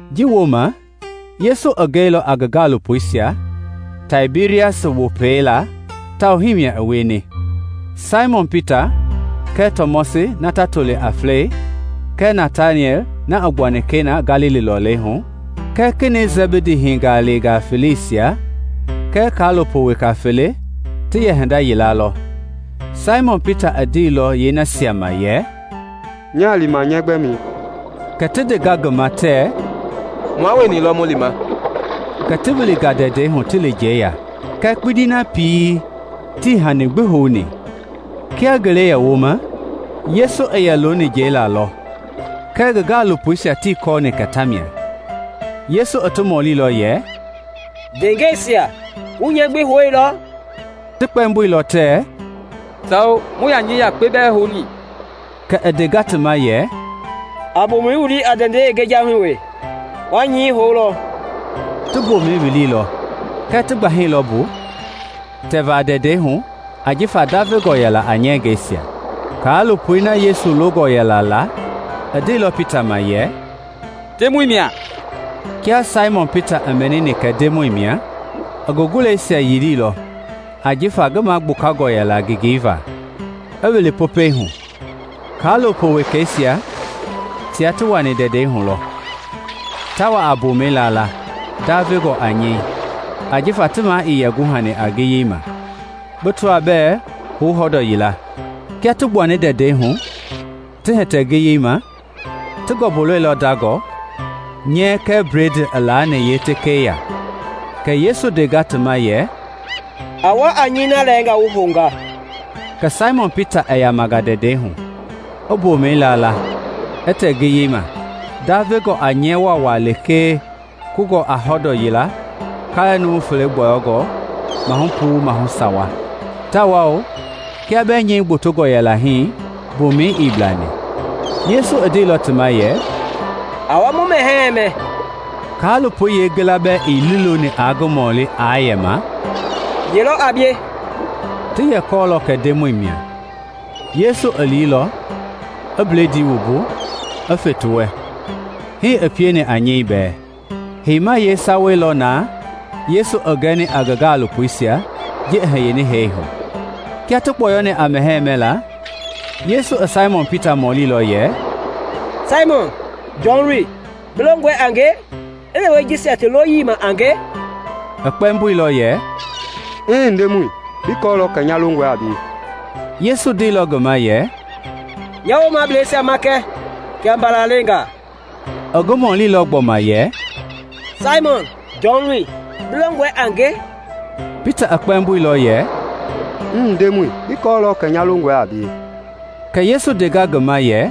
Ji wooma Yesu i gɛilɔ a ngi gaalopoisia Taibirias Wopɛi laa tawao hii i wieni. Saimɔn Pita kɛɛ Tɔmɔsi na ti yɛ toli a Flɛi kɛɛ Nataniɛl na i gbuani Kena, Galili lɔlei hu kɛ Kenɛi Sɛbidi hingaleengaa feleisia kɛɛ ngi gaalopo weka fele ti yɛ hinda yila lɔ. Saimɔn Pita i ndeilɔ yeenasia ma yɛ, “Nyaa lima nyɛɛ gbɛmɛi.” Kɛ ti ndenga ngi ma tɛɛ, “Mua wueni lɔ mu lima.” Kɛ ti wilinga ndɛndɛi hu ti li njɛi ya, kɛɛ kpindi na pii tii hani gbi houni. Kia ngele i yɛ woma, Yesu i yɛ looni njɛi laa lɔ kɛɛ ngi gaalopoisia tii yɛ kɔɔ kɛ tamia. Yesu i ti mɔlilɔ yɛ, “Ndeengɛisia, wu nyɛɛ gbi houilɔɔ?” Ti kpɛmboilɔ tɛɛ, “Sawo, muii yaa nyɛɛ yakpe bɛɛ houni.” Kɛ i ndenga ti ma yɛ, “A mbomɛi wili a ndɛndɛi yeengejahui wee, wa nyɛi houlɔ.” Ti mbomɛi wililɔ kɛɛ ti gbahailɔ mbu tɛva ndɛndɛi hu ajifa ndavengɔ yɛla a nyɛngɛisia. Kaalopoi na Yesu longɔ yɛla la i ndeilɔ Pita ma yɛ, “Ndemɔi mia!” Kia Saimɔn Pita i mɛnini kɛ Ndemɔi mia, i ngi guleisia yiliilɔ ajifa ngi magbukangɔ yɛla ngengei va, i wili Popɛi hu. Kaalopo wekeisia tia ti wani ndɛndɛi hu lɔ, ta wa a mbomɛi laala, ndavengɔ a nyɛi, ajifa ti maa ii yɛ guhani a ngiyei ma, bi tɔa bɛɛ hou hɔndɔɔ yila. Kia ti gbuani ndɛndɛi hu ti hitɛ ngiyei ma, ti ngɔmbui lɔilɔ ndangɔ, nyɛi kɛɛ bledii ti laani yeetekei ya. Kɛ Yesu i ndenga ti ma yɛ, “A wa a nyɛi na lɛɛnga wu hounga.” Kɛ Saimɔn Pita i yamanga ndɛndɛi hu, i mbomɛi laala, i tɛ ngiyei ma, ndavengɔ a nyɛɛ waawaa lekee kungɔ a hɔndɔ yila kaalɛ numu fele gbɔyɔngɔ maahu puu maahu sawa, tawao kia bɛɛ nyɛi gbotongɔ yɛla hii mbomɛi ii blani. Yesu i ndeilɔ ti ma yɛ, “A wa mu mɛhɛɛi mɛ.” Kaalopoisia yeengila bɛɛ ii liiloni aa ngi mɔli aa yɛma, “Ye lɔ a bie?” Ti yɛ kɔɔlɔ kɛ Ndemɔi mia. Yesu i liilɔ, i bledii wumbu, i fe ti wɛ; hii i pieni a nyɛi bɛɛ. Heima yeesawa lɔ na Yesu i gɛni a ngi gaalopoisia ji i hiyeni hee hu. Kia ti kpɔyɔni a mɛhɛɛ mɛla, Yesu i Saimɔn Pita mɔlilɔ yɛ, “Saimɔn, Jɔn loi, bi longɔe a nge i lewe jisia ti loyii ma a nge?” I kpɛmboilɔ yɛ, “Mmm, Ndemɔi, bi kɔɔlɔ kɛ nya longɔe a bie.” Yesu ndeilɔ ngi ma yɛ, “Nya woomableisia makɛ kia mbala leengaa.” I ngi mɔlilɔ gbɔma yɛ, “Saimɔn, Jɔn loi, bi longɔe a nge?” Pita i kpɛmboilɔ yɛ, “Mmm, Ndemɔi, bi kɔɔlɔ kɛ nya longɔe a bie.” Kɛ Yesu ndenga ngi ma yɛ,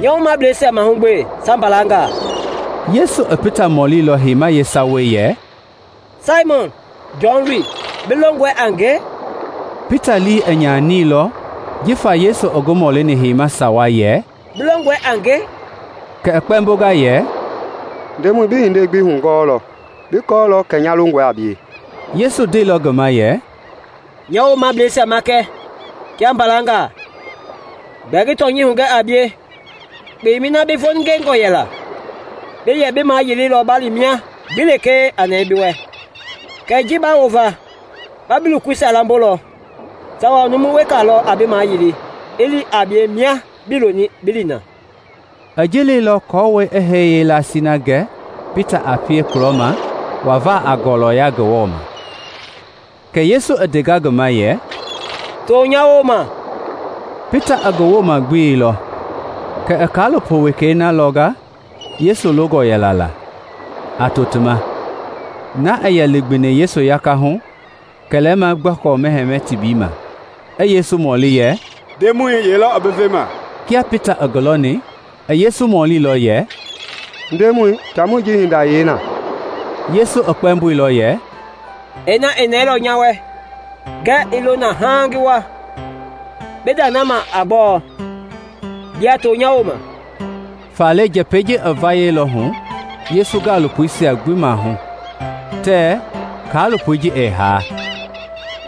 “Nya woomableisia mahugbe kia mbalangaa.” Yesu i Pita mɔlilɔ heima yeesawei yɛ, “Saimɔn, Jɔn loi, bi longɔe a nge?” Pita lii i nyanilɔ jifa Yesu i ngi mɔlini heima sawa yɛ, “Bi longɔe a nge?” Kɛ i kpɛmbonga yɛ, “Ndemɔi, bi hindei gbi hugɔɔlɔ; bi kɔɔlɔ kɛ nya longɔe a bie.” Yesu ndeilɔ ngi ma yɛ, “Nya woomableisia makɛ kia mbalangaa. Gbɛɛ ngi tɔnyɛi hugɛ a bie, kpemɛi na bi voningengɔ yɛla, bi yɛ bi mayililɔ ba li mia gbi lekee a nɛɛ bi wɛ; kɛɛ ji ba wova, ba bi lokoisia lambolɔ, tawao numu weka lɔ a bi maayili i li a bie mia bii loni bi li na.” (I ji leilɔ aako i hee yeelasii na gɛ Pita a pie kulɔma wava a ngɔlɔya Ngewɔ ma.) Kɛ Yesu i ndenga ngi ma yɛ, “To nya wooma.” Pita i ngi wooma gbeilɔ kɛ i kaalopo wekei na lɔnga Yesu longɔ yɛla la, a to ti ma -- na i yɛ ligbini Yesu gakahu kɛlɛma gbɔkɔ mɛhɛɛ tebii ma, i Yesu mɔlini yɛ, “Ndemɔi, ye lɔ i bi vema?” Kia Pita i ngi lɔni, i Yesu mɔlilɔ yɛ, “Ndemɔi, taamɔi ji hinda i yee na?” Yesu i kpɛmboilɔ yɛ, “Ina i nɛɛlɔ nya wɛ ngɛɛ i lo na haaŋ ngi wa, bi nda i na ma a gbɔɔ? Bia to nya wooma!” Faale njɛpɛi ji i vayɛilɔ Yesu gaalopoisia gbi maahu tɛɛ kaalopoi ji ɛɛ haa;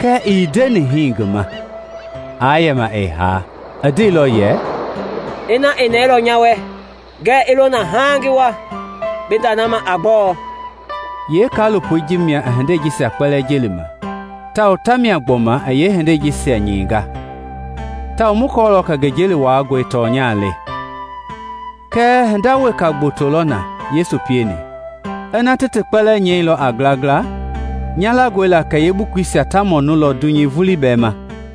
kɛɛ ii ndeni ngi ma aa yɛma ɛɛ haa; i ndeilɔ yɛ, “Ina i nɛɛlɔ nya wɛ ngɛɛ i lo na haaŋ ngi wa, bi nda na ma a gbɔɔ?” Yeekaalopoi ji mia i hindei jisia jelima, tawao tamia gbɔma i yeehindei jisia nyɛinga; tawao mu kɔɔlɔ kɛ ngi jeli wuaangɔi tɔnya le. Kɛɛ hinda weka gboto lɔ na Yesu pieni; kiaa ti ti kpɛlɛɛ nyɛilɔ a ngilangila, nya langɔ la kɛ yeebukuisia taa mɔnulɔ dunyei vulii bɛɛ ma.